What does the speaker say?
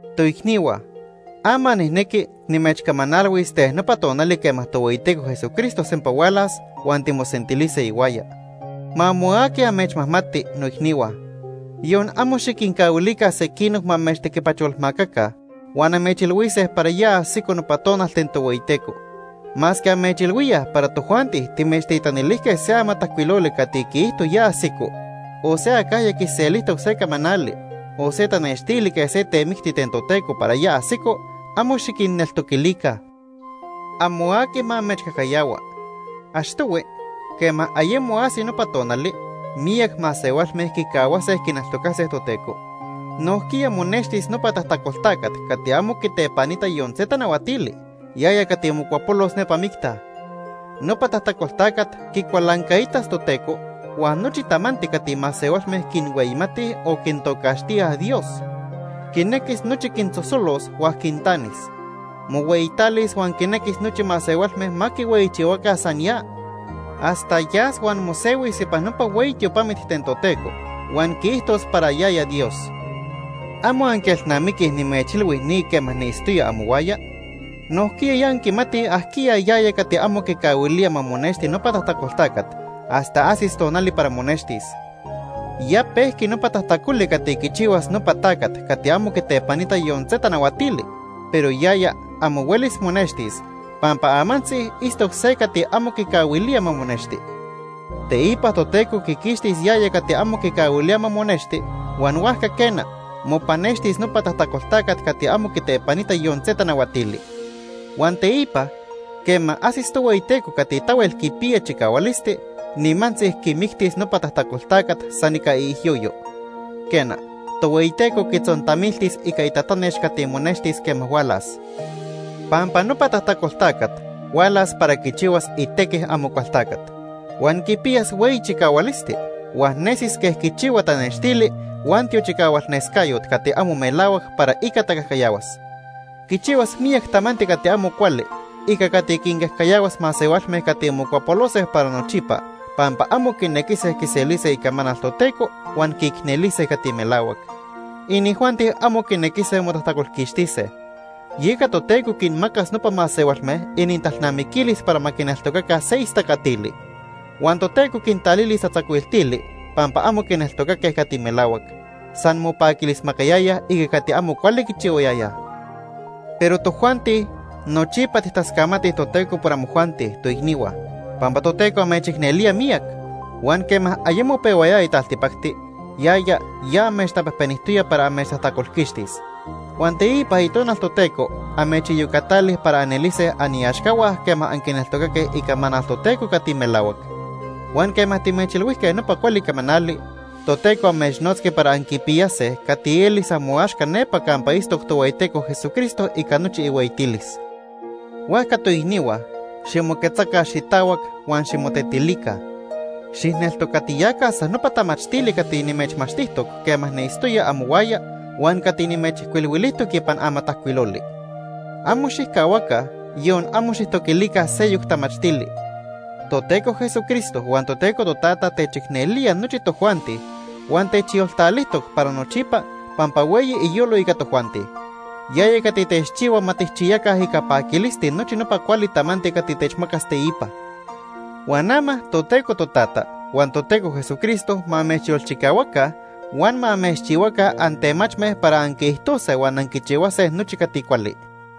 Toicnihua, ama nijnequi nimechcamanalhuis ten nopa tonali quema Tohueyiteco Jesucristo sempa hualas huan timosentilise ihuaya. Ma amo aqui amechmajmati, noicnihua. Yon amo xiquincahuilica sequinoc ma amechtequipacholmacaca huan amechilhuise para ya ajsico nopa tonal ten Tohueyiteco. Masque amechilhuíaj para tojuanti timechtitanilijque se amatajcuiloli cati quiijto ya ajsico, o se acajya quiselijtoc se camanali, o se tanextili quej se temicti ten Toteco para ya ajsico, amo xiquinneltoquilica. Amo aqui ma amechcajcayahua. Achtohui, quema ayemo ajsi nopa tonali, miyac masehualme quicahuase quineltocase Toteco. Nojquiya monextis nopa tajtacol tacat cati amo quitepanita yon se tanahuatili, yaya cati mocuapolos nepa micta. Nopa tajtacol tacat quicualancaitas Toteco huan nochi tamanti cati masehualme quinhueyimatij o quintocaxtíaj “dios”. Quinequis nochi quinsosolos huan quintanis. Mohueyitalis huan quinequis nochi masehualme ma quihueyichihuaca san ya. Hasta yas huan mosehuis ipan nopa hueyi tiopamit ten Toteco huan quiijtos para yaya Dios. ¿Amo anquielnamiquij nimechilhui ni quema niitztoya amohuaya? Nojquiya ya anquimatij ajquiya yaya cati amo quicahuilía ma monexti nopa tajtacol tacat hasta ajsis tonali para monextis. Ya pejqui nopa tajtacoli cati quichihuas nopa tacat cati amo quitepanita yon se tanahuatili, pero yaya amo huelis monextis, pampa amantzi itztoc se cati amo quicahuilía ma monexti. Teipa Toteco quiquixtis yaya cati amo quicahuilía ma monexti, huan huajca quena, mopanextis nopa tajtacol tacat cati amo quitepanita yon se tanahuatili. Huan teipa, quema ajsis Tohueyiteco cati tahuel quipiya chicahualisti, nimantzi quimictis nopa tajtacol tacat san ica iijyoyo. Quena, Tohueyiteco quitzontamiltis ica itatanex cati monextis quema hualas. Pampa nopa tajtacol tacat hualas para quichihuas itequi Amocualtacat, huan quipiyas hueyi chicahualisti, huan nesis quej quichihua tanextili huan tiochicahualnescayot cati amo melahuac para ica tacajcayahuas. Quichihuas miyac tamanti cati amo cuali ica cati quincajcayahuas masehualme cati mocuapolose para nochipa pampa amo quinequise quiselise icamanal Toteco huan quiicnelise cati melahuac. Inijuanti amo quinequise motajtacolquixtise. Yeca Toteco quinmacas nopa masehualme inintalnamiquilis para ma quineltocaca se istacatili. Huan Toteco quintalilis tatzacuiltili pampa amo quineltocaque cati melahuac. San mopaquilismacayayaj ica cati amo cuali quichihuayayaj. Pero tojuanti, nochipa tijtascamatij Toteco por amojuanti, toicnihua, pampa Toteco amechicnelía miyac. Huan quema ayemo pehuayaya taltipacti, yaya ya amechtapejpenijtoya para amechtajtacolquixtis. Huan teipa Itonal Toteco amechiyocatali para anelise aniaxcahua quema anquineltocaque icamanal Toteco cati melahuac. Huan quema timechilhuijque nopa cuali camanali, Toteco amechnotzqui para anquipiyase cati elis amoaxca nepa campa itztoc Tohueyiteco Jesucristo ica nochi ihueyitilis. Huajca, toicnihua, ximoquetzaca xitahuac huan ximotetilica. Xijneltocatiyaca san nopa tamachtili cati nimechmachtijtoc quema niitztoya amohuaya huan cati nimechijcuilhuilijtoc ipan amatajcuiloli. Amo xijcahuaca, yon amo xijtoquilica seyoc tamachtili. Toteco Jesucristo huan Toteco Totata techicnelía nochi tojuanti huan techyoltalijtoc para nochipa pampa hueyi iyolo ica tojuanti. Yaya cati techchihua ma tijchiyaca ica paquilisti nochi nopa cuali tamanti cati techmacas teipa. Huan ama Toteco Totata huan Toteco Jesucristo ma amechyolchicahuaca huan ma amechchihuaca antemachme para anquiijtose huan anquichihuase nochi cati cuali.